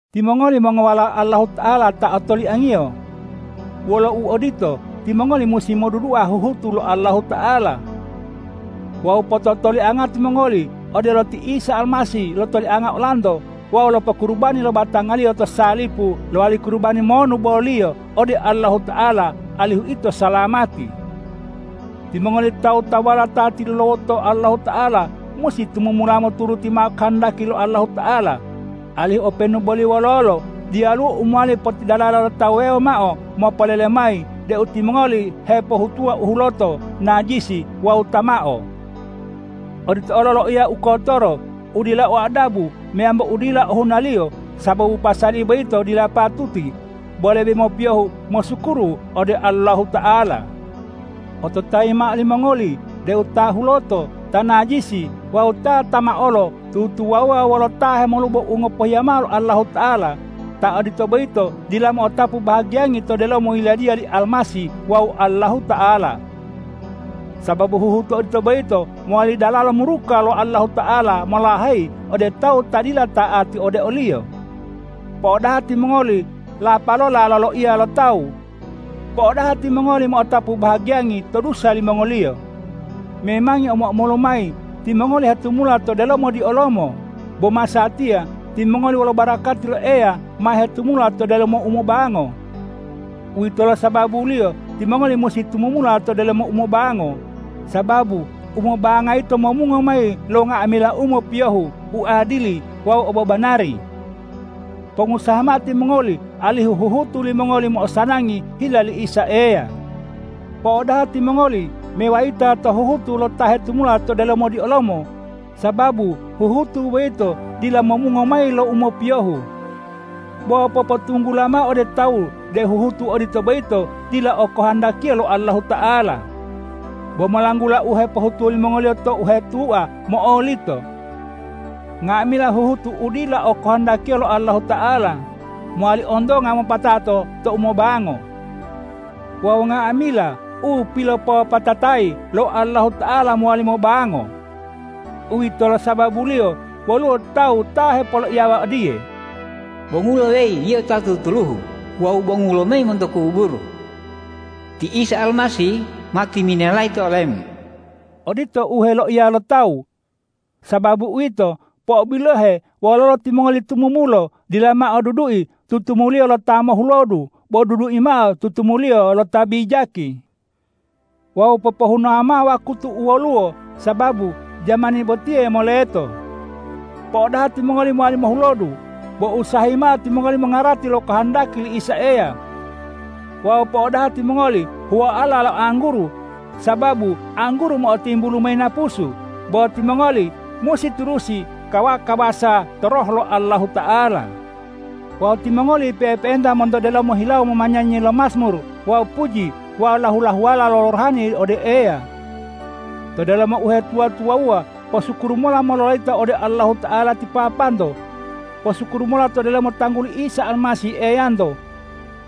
Timongoli mongowalao Allahuta'ala ta otoliang-Iyo. Wolo uodito, timongoli musi modudua huhutu lo Allahuta'ala. Wawu pototolianga timongoli odelo ti Isa Almasih lotolianga olanto wawu lopokurubani lo batanga-Liyo to salipu lowali kurubani monu boliyo ode Allahuta'ala alihu ito salamati. Timongoli tawu-tawuwala ta tilulawoto Allahuta'ala musi tumumula moturuti mao kohondaki lo Allahuta'ala, alihu openu boli wololo diyaluwo u mowali potidalala lo tawu wuwewo mao mopolele mayi deu timongoli hepohutuwa u huloto, najisi wawu tamao. Odito olo loiya u kotoro, u dila o adabu meyambo u dila ohunaliyo sababu pasali boyito dila patuti, bo lebe mopiyohu mosukuru ode Allahuta'ala. Ototayi mao limongoli deu ta huloto, ta najisi wawu ta tamaolo tutuwawuwa wolo ta hemolubo u ngopohiya mao lo Allahuta'ala, ta odito boyito dila mo'otapu bahagiyangi to delomo yiladiya li Almasih wawu Allahuta'ala. Sababu huhutu odito boyito mowali dalalo muruka lo Allahuta'ala molaheyi ode tawu ta dila ta'ati ode o-Liyo. Po'odaha timongoli lapalola loloiya lo tawu. Po'odaha timongoli mo'otapu bahagiyangi to dusa limongoliyo. Memangi omo-omolu mayi timongoli hetumula to delomo diolomo, bo masatiya timongoli wolo barakati lo Eya ma hetumula to delomo umobango. Uwitolo sababuliyo timongoli musi tumumula to delomo umobango, sababu umobanga yito momungo mayi lo nga'amila u mopiyohu, u adili wawu obobanari. Pongusaha mao timongoli alihu huhutu limongoli mo'osanangi hila li Isa Eya. Po'odaha timongoli mewayita to huhutu lo ta hetumula to delomo diolomo, sababu huhutu boyito dila momungo mayi lo u mopiyohu. Bo popotunggula mao ode tawu deu huhutu odito boyito dila okohondakiya lo Allahuta'ala. Bo molanggula u hepohutuwo limongoliyo to u hetua, mo'olito. Nga'amila huhutu u dila okohondakiya lo Allahuta'ala mowali ontonga mopatato tou mobango. Wawu nga'amila u pilopopatatayi lo Allahuta'ala mowali mobango. Uwitolo sababuliyo woluwo tawu ta hepoloiyawa odiye,”Bongulo weyi yio ta tutuluhu wawu bongu lomayi monto kuburu! Ti Isa Almasih ma timinelayi to olemu.” Odito u heloiya lo tawu. Sababu uwito, po'obilohe wololo timongoli tumumulo, dila mao dudui tutumuliyo lo ta mohulodu, bo dudui mao tutumuliyo lo ta bijaki. Wawu popohunawa mao wakutu u woluwo, sababu jamani botiye moleto. Po'odaha timongoli mowali mohulodu, bo usahayi mao timongoli mongarati lo kohondaki li Isa Eya. Wawu po'odaha timongoli huwoala lo angguru, sababu angguru mo'otimbulu mayi napusu, bo timongoli musi turusi kawa-kawasa to Roh lo Allahuta'ala. Wawu timongoli pe'epe'enta monto delomo hilawo momanyanyi lo majmur wawu puji wawu lahu-lahuwala rohani ode Eya. To delomo uhetuwa-tuwawuwa posukuru mola mololayita ode Allahuta'ala ti Papanto. Posukuru mola to delomo tangguli Isa Almasih Eyanto.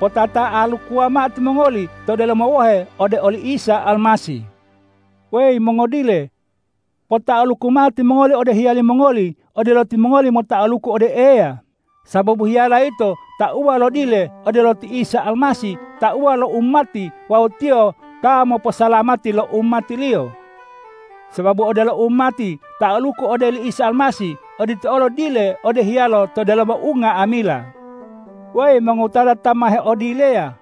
Potata'alukuwa mao timongoli to delomo wohe ode oli Isa Almasih. Weyi mongodile! Pota'aluku mao timongoli ode hiyali mongoli odelo timongoli mota'aluku ode Eya, sababu hiyala yito tauwa lo dile odelo ti Isa Almasih tauwa lo umati wawu Tiyo ta moposalamati lo umati-Liyo. Sababu odelo umati ta'aluku ode li Isa Almasih, odito olo dile ode hiyalo to delomo unga'amila. Weyi mongowutata ta ma heodileya!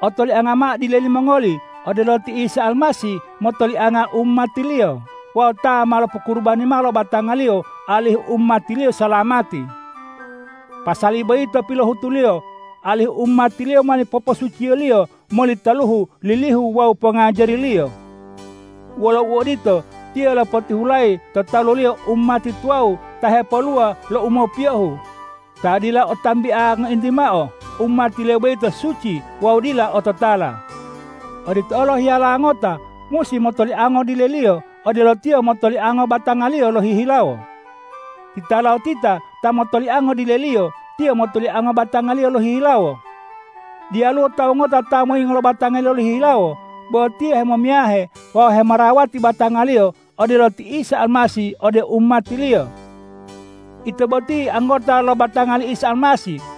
Otolianga mao dile limongoli odelo ti Isa Almasih motolianga umati-Liyo wawu ta ma lopokurubani mao lo batanga-Liyo alihu umati-Liyo salamati. Pasali boyito pilohutu-Liyo, alihu umati-Liyo mowali poposuciyo-Liyo moli taluhu lilihu wawu pongajari-Liyo. Wolo uodito, Tiyo lopotihulayi to talu-Liyo umati tuwawu ta hepoluwa lo u mopiyohu, ta dila o tambia ngointi mao. Umati-Liyo boyito suci wawu dila ototala. Odito olo hiyala ngota musi motoliango dileliyo odelo tiyo motoliango batangaliyo lohihilawo. Titalotita ta motoliango dileliyo, tiyo motoliango batangaliyo lohihilawo. Diyaluwo tawu ngota ta moyingo lo batangaliyo lohihilawo, bo tiyo hemomiyahe wawu hemorawati batangaliyo odelo ti Isa Almasih ode umati-Liyo. Ito boti anggota lo batanga li Isa Almasih.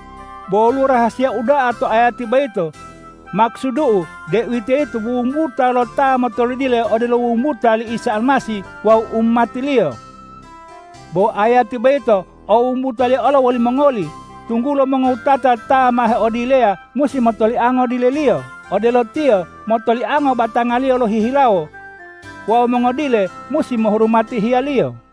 Bo woluwo rahasiya uda'a to ayati boyito. Makusudu'u, deuwitoyito wumbuta lo ta motolodile odelo wumbuta li Isa Almasih wawu umati-Liyo. Bo ayati boyito o wumbutaliyo olo wolimongoli, tunggulo mongowutata ta ma heodileya musi motoliango dileliyo odelo tiyo motoliango batangaliyo lohihilawo. Wawu mongodile musi mohurumati hiyaliyo.